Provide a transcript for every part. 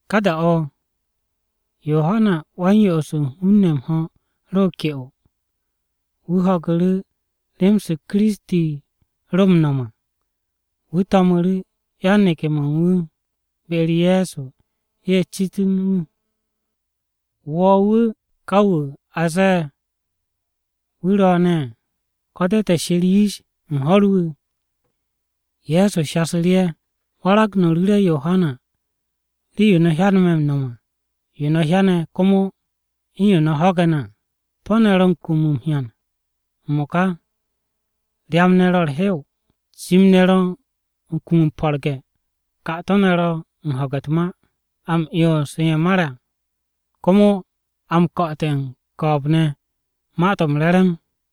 Ka da-o̱ Yohana Wa-m-Yo'os u̱n hun-ne̱ m-ho̱ ro ke'o, wu̱ ho̱gu̱ru̱ rem-se Kiristi ro m-no̱m à. Wu̱ to̱mu̱ru̱ yan-neke̱-mo̱ u̱n wu̱ be-u̱r Ye̱so ye̱ citu̱ru̱ wu̱. “¿Wo̱ wu̱ ka wu̱ a zee wu̱ ro̱o̱ne̱, ko̱ te̱ she̱r yish u̱n ho̱r wu̱?” Ye̱so shasu̱ru̱ ye̱, “Warag no̱ ru̱re̱ Yohana rii-yo me̱ m-no̱m à, yo no̱ hyane̱ komo u̱n yo no̱ ho̱ge̱ ne̱ à: Po̱-ne̱ ro̱ m-kum o-hyan m-mo̱ka. Ryam-ne̱ ro̱ u̱r-hew, cim-ne̱ ro̱ u̱n kum m-po̱rge̱, 'kato̱-ne̱ ro̱ m-ho̱ge̱ u̱t-ma, a m-'yons u̱n ye̱ mare̱ à, komo a m-ko̱'o̱te̱ u̱n ko̱o̱b ne̱ Ma-to̱ m-Re̱re̱m.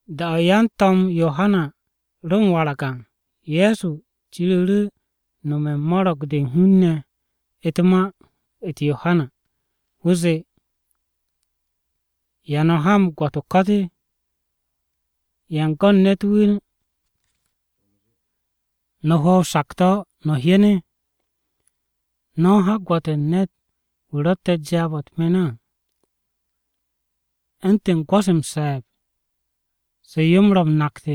Da-o̱ yan-to̱m Yohana ro̱ m-warag à, Ye̱so ciru̱ru̱ nome̱ u̱n mo̱ro̱g-de u̱n hun-ne̱ ma-u̱t Yohana, wu̱ zee, “¿Ya no̱ ha m-gwo̱t o-ko̱t? ¿Yan go̱n ne̱t-wu̱ no̱ hwo̱ o-sakto̱ no̱ hyen? ¿No̱ u̱n ha gwo̱t u̱n ne̱t-wu̱ ro̱tte̱ jaab-o̱ u̱t-me̱n á, u̱ntu̱n gwo̱-se m-se̱e̱b se yo-m mo̱ m-nakt?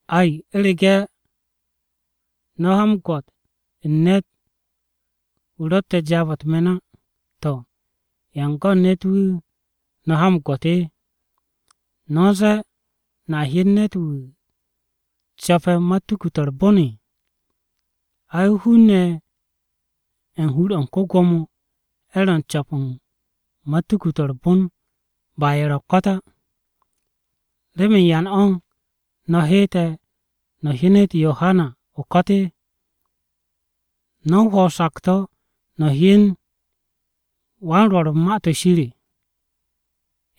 Ai, u̱rege̱ no̱ ha m-gwo̱t u̱n ne̱t-wu̱ ro̱tte̱ jaab-o̱ u̱t-me̱n á, ¿to̱ yan go̱n ne̱t-wu̱ no̱ ha m-gwo̱t? ¿No̱ u̱n zee no̱a hyen ne̱t-wu̱ co̱pe̱ matuku-to̱ u̱r-bon? Ay, hun-ne̱ ye̱ u̱n hur-o̱ u̱n ko-Gwo̱mo, ye̱ ro̱ m-co̱p u̱n matuku-to̱ u̱r-bon ba ye̱ ro̱ o-ko̱t á. ¿Remen yan o̱ no̱ heete̱ no̱ hyenet Yohana o-ko̱t? ¿No̱ u̱n hwo̱ o-sakto̱ no̱ hyen wan-rwo̱r u̱n Ma-to̱ Shir?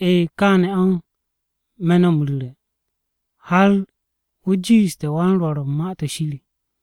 E̱e̱, kaane̱ o̱ me̱ no̱ m-ru̱re̱ har wu̱ jiishte̱ wan-rwo̱r u̱n Ma-to̱ Shir à.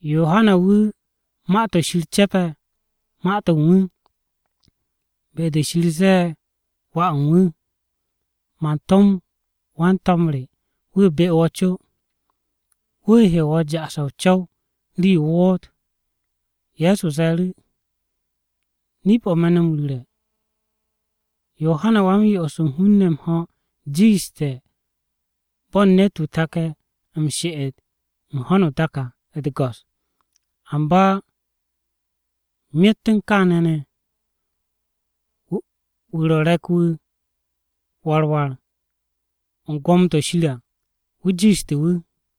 Yohana wu̱ Ma-to̱ Shir ce̱pe̱ ma-to̱ u̱n wu̱, be-de Shir zee Wà u̱n wu̱, “ ‘Man tom wan-to̱m re wu̱ be wo̱ co. Wu̱ he wo̱ ja'ase̱ o-co̱w rii-yo o woot.’” Ye̱so ze̱e̱ru̱, “Nip-o̱ me̱ no̱ m-ru̱re̱, Yohana Wa-m-Yo'os u̱n hun-ne̱ m-ho̱ jiishte̱ bo̱n ne̱t-wu̱ take̱ m-she'et u̱n ho̱no o-dak à u̱t-go̱s. Amba myet u̱n kaane̱ ne̱, wu̱ ro̱ re̱k-wu̱ war war u̱n gwo̱mo-to̱ Shir à, wu̱ jiishte̱ wu̱.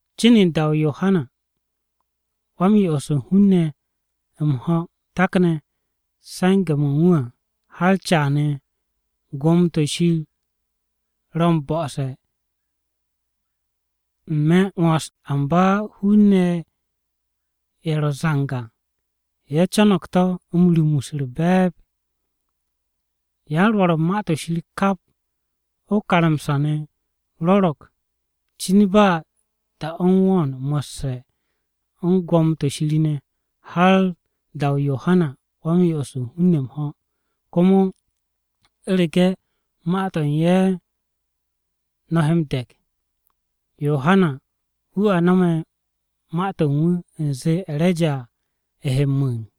Cin u̱n da-o̱ Yohana Wa-m-Yo'os u̱n hun-ne̱ m-ho̱ takne̱ se̱nge̱-mo̱ u̱n wu̱ à har caane̱, Gwo̱mo-to̱ Shir ro̱ m-bo̱se̱ n-me̱ m-'wo̱ns. Amba hun-ne̱ ye̱ ro̱ zang à, ye̱ co̱no̱g to̱ m-rumus u̱r-be̱e̱b. Yan-rwo̱r u̱n Ma-to̱ Shir kap o-karamsa ne̱ rwo̱ro̱g cin ba da-o̱ u̱n wo̱o̱n mo̱sse̱ u̱n gwo̱mo-to̱ Shir ne̱, har da-o Yohana Wa-m-Yo'os u̱n hun-ne̱ m-ho̱. Komo u̱rege̱ ma-to̱ u̱n ye̱ no̱ he m-de̱k, Yohana wu̱ a no̱me̱ ma-to̱ u̱n wu̱ u̱n zee E̱reja he m-mu̱u̱n.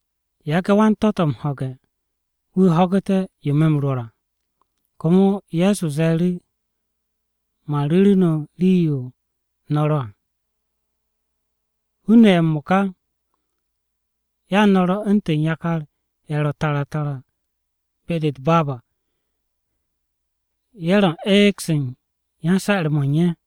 Yage̱ wan-tó̱-tò̱ m-ho̱ge̱, wu̱ ho̱gu̱te̱ yo me̱ m-rwo̱r à.” Komo Ye̱so ze̱e̱ru̱, “Man ru̱ru̱ no̱ rii-yo no̱ ro̱ à, hun-ne̱ ye̱ m-mo̱ka. Ya no̱ ro̱ u̱ntu̱n yakar-ye̱ ro̱ tara tara be-de u̱t-baab à, ye̱ ro̱ u̱n eeg-se u̱n yan-se̱'e̱r-mo̱ u̱n ye̱,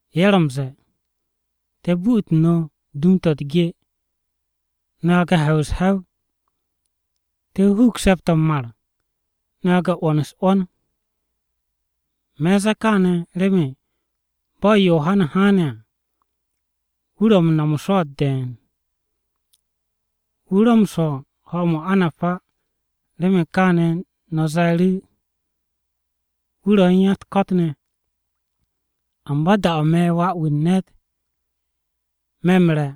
ye̱ ro̱ m-ze̱e̱: “ ‘Te̱ bu'utu no̱ dum-to̱ u̱t-ge, no̱ yage̱ m-he̱w u̱s-he̱w! Te̱ huug se̱p-o̱ m-mar, no̱ yage̱ m-'wo̱n u̱s-'wo̱n!’ Me̱ u̱n zee kaane̱ remen bo̱ Yohana haane̱ à, wu̱ ro̱ u̱n no̱m o-swo̱o̱t de̱e̱n, wu̱ ro̱ m-swo̱ u̱n ho̱-mo̱ o-anab á. Remen kaane̱ no̱ ze̱e̱ru̱, ‘Wu̱ ro̱ u̱n ko-ya-u̱t-ko̱t ne̱!’ Amba da-o̱ me̱, Wà-wu̱ u̱n ne̱t, me̱ m-re̱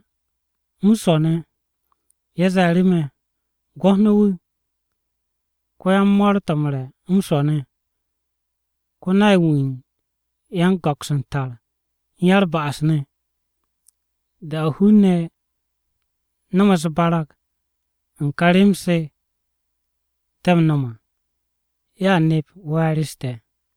m-swo̱ ne̱. Ye̱ ze̱e̱ru̱ me̱, ‘Gwo̱t no̱ wu̱, ko-yan-mo̱o̱r-to̱ m-re̱ m-swo̱ ne̱. Ko-nay-wu̱ u̱n yan-go̱ks u̱n tar u̱n ya-u̱r-ba'as ne̱!’ Da-o̱ hun-ne̱ ye̱ no̱me̱ u̱s-barag u̱n ka rem-se te̱ m-no̱m à, ye̱a nep we̱e̱r-u̱s te̱.”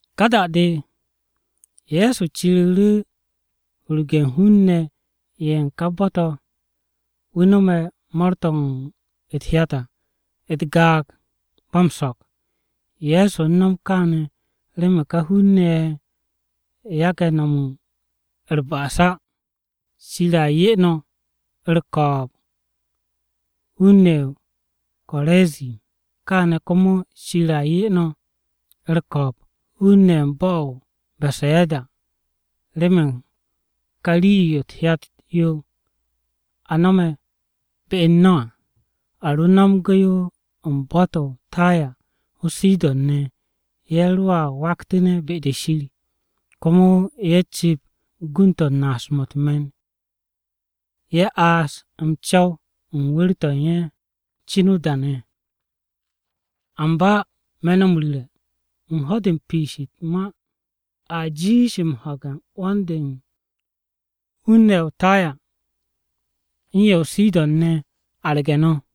Ka da-de Ye̱so ciru̱ru̱ hurgun hun-ne̱ ye̱ u̱n ká bo̱-to̱ to̱ wu̱ nomte̱ mo̱o̱r-to̱ u̱t-hyat à, u̱t-gaag ba m-so̱k. Ye̱so u̱n nom kaane̱ remen ká hun-ne̱ ye̱ yage̱ no̱m u̱r-ba'as á. “Shir a 'ye no̱ u̱r-ko̱o̱b hun-ne̱ ye̱ o-Korazin! Kaane̱ komo Shir a 'ye no̱ u̱r-ko̱o̱b hun-ne̱ ye̱ u̱n bo̱-o̱ o-Besayada! Remen kà rii-yo u̱t-hyat yo a no̱me̱ be u̱n no̱ à. A ro nomge̱ yo u̱n bo̱-to̱ o-Taya o-Sidon ne̱, ye̱ roa waktu̱ne̱ be-de Shir. Komo ye̱ cu̱p gund-to̱ u̱n naasu̱-mo̱ u̱t-me̱n, ye̱ aas m-co̱w u̱n wu̱r-to̱ u̱n ye̱ cin o-da ne̱. Amba me̱ no̱ m-ru̱re̱, u̱n ho̱-de u̱n piish u̱t-ma a jiish m-ho̱ge̱ u̱n 'wo̱n-de u̱n hun-ne̱ ye̱ o-Taya u̱n ye̱ o-Sidon ne̱ arge̱ no̱.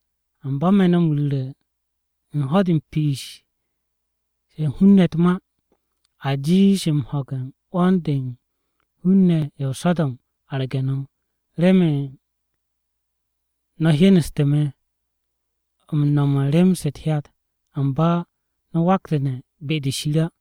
Amba me̱ no̱ m-ru̱re̱ u̱n ho̱-de u̱n piishe̱ u̱n hun-ne̱ u̱t-ma, a jiish m-ho̱ge̱ u̱n 'wo̱n-de u̱n hun-ne̱ ye̱ o-So̱do̱m arge̱ no̱. Remen no̱ hyenestu̱ me̱ m-no̱m u̱n rem-se u̱t-hyat, amba no̱ waktu̱ne̱ be-de Shir á.”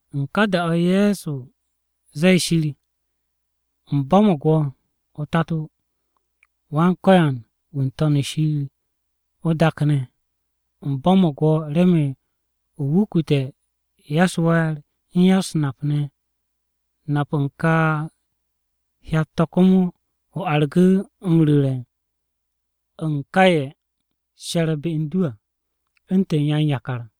U̱n ka da-o̱ Ye̱so zee Shir, “U̱m bo̱mo̱g wo̱, o-Tato, Wan-Ko̱yan wu̱ n-To̱n shir o-dak ne̱. U̱m bo̱mo̱g wo̱ remen o wukute̱ ya-u̱s-we̱e̱r u̱n ya-u̱s-nap ne̱. Nap u̱n ka hyat-to̱ komo o argu̱ m-ru̱re̱ u̱n ka ye̱ she̱re̱ be u̱n du à u̱ntu̱n yan-yakar.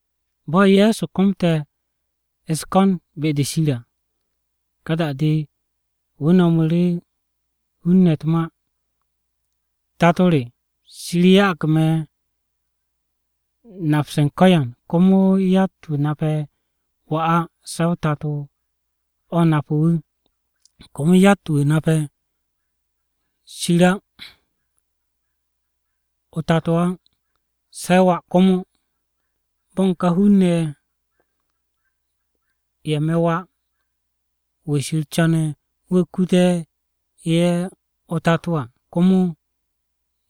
Bo̱ Ye̱so komte̱ u̱s-ko̱n be-de Shir à, ka da-de wu̱ nomu̱ru̱ hun-ne̱ u̱t-ma. “Tato re, Shir ya'ag me̱ nap-se u̱n ko̱yan. Komo yatt-wu̱ nape̱ Wà á se̱ o-Tato o̱ nape̱ wu̱. Komo yatt-wu̱ nape̱ Shir o-Tato á se̱ Wà, komo bo̱ u̱n ka hun-ne̱ ye̱, ye̱ me̱ Wà-wu̱ Shir co̱ne̱ wu̱ kute̱ ye̱ o-Tato à, komo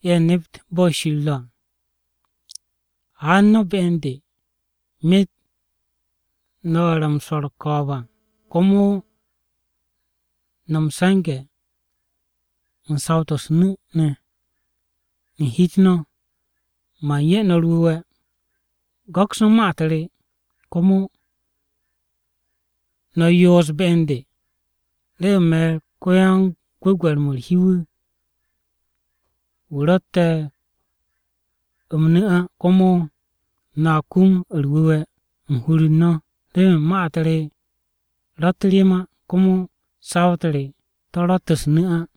ye̱ nept bo̱ Shir ro̱ à. “Haan no̱ be u̱n de, myet no̱ ye̱ ro̱ m-swo̱ u̱r-ko̱o̱b à, komo no̱ m-se̱nge̱ u̱n saw-to̱ u̱s-nu̱ ne̱ u̱n hi-u̱t no̱, man 'ye no̱ u̱r-wu̱we̱. Go̱ks no̱ ma-u̱t re, komo no̱ yoos be u̱n de, remen me̱ ko-yan-gwu̱gwe̱r-mo̱ u̱r-hi wu̱, wu̱ ro̱tte̱ m-nu̱ á komo no̱a kum u̱r-wu̱we̱ u̱n hur-u̱r no̱. Remen ma-u̱t re ro̱tt rem á, komo saw-u̱t re to̱ ro̱tt u̱s-nu̱ á.”